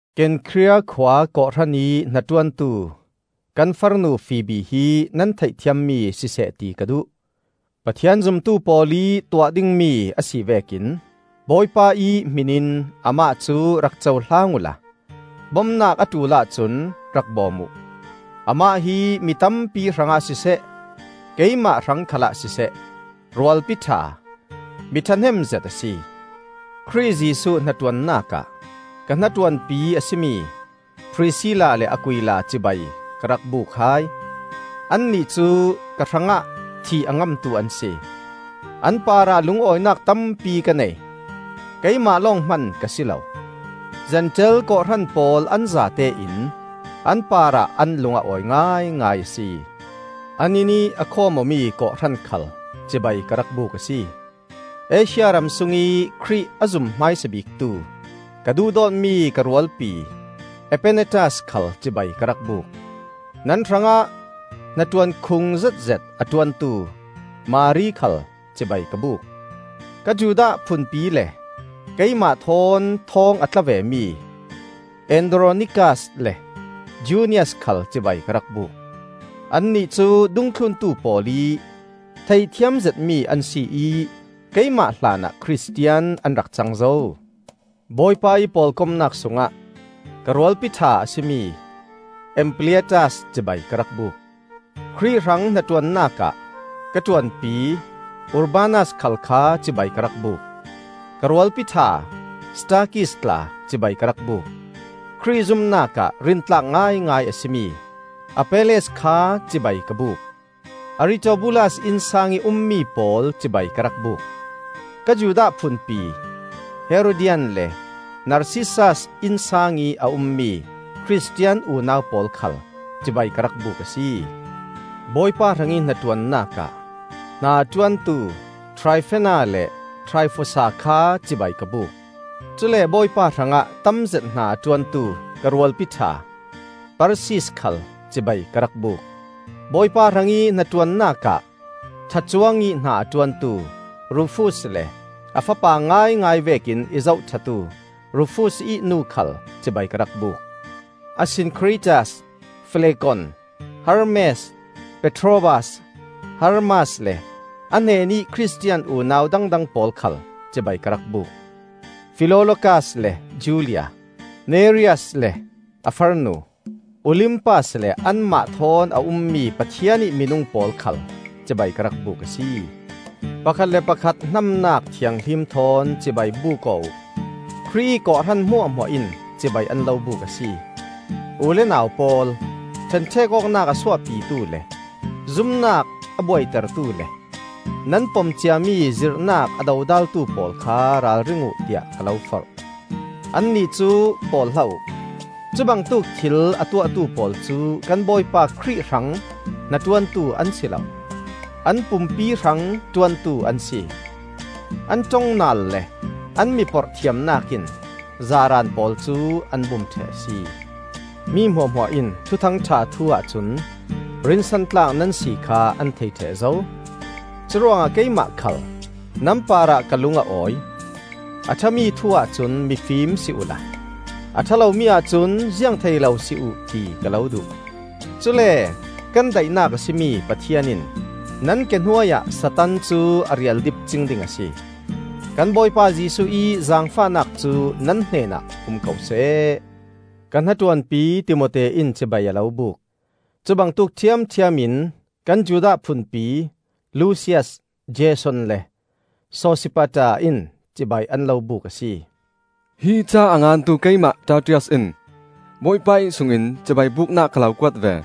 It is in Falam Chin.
Kenkhria khua kawhhran ih hnaṭuantu kan farnu Fibi hi nan theihthiammi siseh ti ka duh. Pathian zumtu pawl ih tuah dingmi a si vekin Bawipa ih hmin in amah cu rak cohlang uhla bomnak a ṭul ahcun rak bawm uh. Amah hi mi tampi hrangah siseh, keimah hrang khalah siseh, rualpi ṭha, mi ṭhahnem zet a si. Khrih Jesuh hnaṭuannak ah ka hnaṭuanpi a si mi Prisilla le Aquila cibai ka rak buk hai. Annih cu ka hrangah thih a ngamtu an si. An parah lungawinak tampi ka nei; keimah lawng hman ka si lo, Zentail kawhhran pawl an zatein an parah an lung a awi ngaingai a si. An innih a khawm awmi kawhhran khal cibai ka rak buk a si. Asia ram sungih Khrih a zum hmaisa biktu ka duhdawtmi ka rualpi Epenetas khal cibai ka rak buk. Nan hrangah hnaṭuan khung zetzet a ṭuantu Mari khal cibai ka buk. Ka Judah phunpi le keimah thawn thawng a tla vemi Andronikas le Junias khal cibai ka rak buk. Annih cu dungthluntu pawl ih theihthiam zetmi an si ih keimah hlanah Khristian an rak cang zo. Bawipa ih pawlkomnak sungah ka rualpi ṭha a si mi Ampliatas cibai ka rak buk. Khrih hrang hnaṭuannak ah kan ṭuanpi Urbanas khal kha cibai ka rak buk; ka rualpi ṭha Stakis tla cibai ka rak buk. Khrih zumnak ah rintlak ngaingai a si mi Apelles kha cibai ka buk. Aritobulas innsang ih ummi pawl cibai ka rak buk. Ka Judah phunpi, Herodian le Narsissas innsang ih a ummi Khristian unau pawl khal cibai ka rak buk a si. Bawipa hrang ih hnaṭuannak ah hna a ṭuantu Traifena le Traifosa kha cibai ka buk; cule Bawipa hrangah ih tamzet hna a ṭuantu ka rualpi ṭha Persis khal cibai ka rak buk. Bawipa hrang ih hnaṭuannak ah ṭha cuangih hna a ṭuantu Rufus le a fapa ngaingai vekin i zohṭhatu Rufus ih nu khal cibai ka rak buk. Asinkhritas, Flegon, Hermes, Patrobas, Hermas le an hnenih Khristian unau dangdang pawl khal cibai ka rak buk. Filologas le Julia, Nereus le a farnu, Olimpas le anmah thawn a ummi Pathian ih minung pawl khal cibai ka rak buk a si. Pakhat le pakhat hnamnak thianghlim thawn cibai buk aw uh. Khrih ih kawhhran hmuahhmuah in cibai an lo buk a si. U le nau pawl, ṭhenṭhek awknak a suahpitu le zumnak a buaitertu le nan pom ciami zirhnak a dodaltu pawl kha ralring uh tiah ka lo forh. Annih cu pawl hlah uh. Cubangtuk thil a tuahtu pawl cu kan Bawipa Khrih hrang hnaṭuantu an si lo; an pumpi hrang ṭuantu an si. An ṭong naal le an mi porhthiamnak in zaaraan pawl cu an bum ṭheh a si. Mi hmuahhmuah in Thuthang ṭha thu ahcun rinsan tlak nan si kha an thei ṭheh zo; curuangah keimah khal nan parah ka lung a awi. A ṭhami thu ahcun mifim si uhla a ṭha lomi ahcun ziang thei lo si uh ti ka lo duh. Cule kan daihnak a si mi Pathian in nan ke hnuai ah Satan cu a rialdip cing ding a si. Kan Bawipa Jesuh ih zaangfahnak cu nan hnenah um ko seh. Ka hnaṭuanpi Timote in cibai a lo buk. Cubangtuk ṭhiamṭhiam kan Judah phunpi, Lusias, Jason le Sosipater in cibai an lo buk a si. Hi ca a ngantu keimah Tertius in Bawipa ih sung in cibai buknak ka lo kuat ve.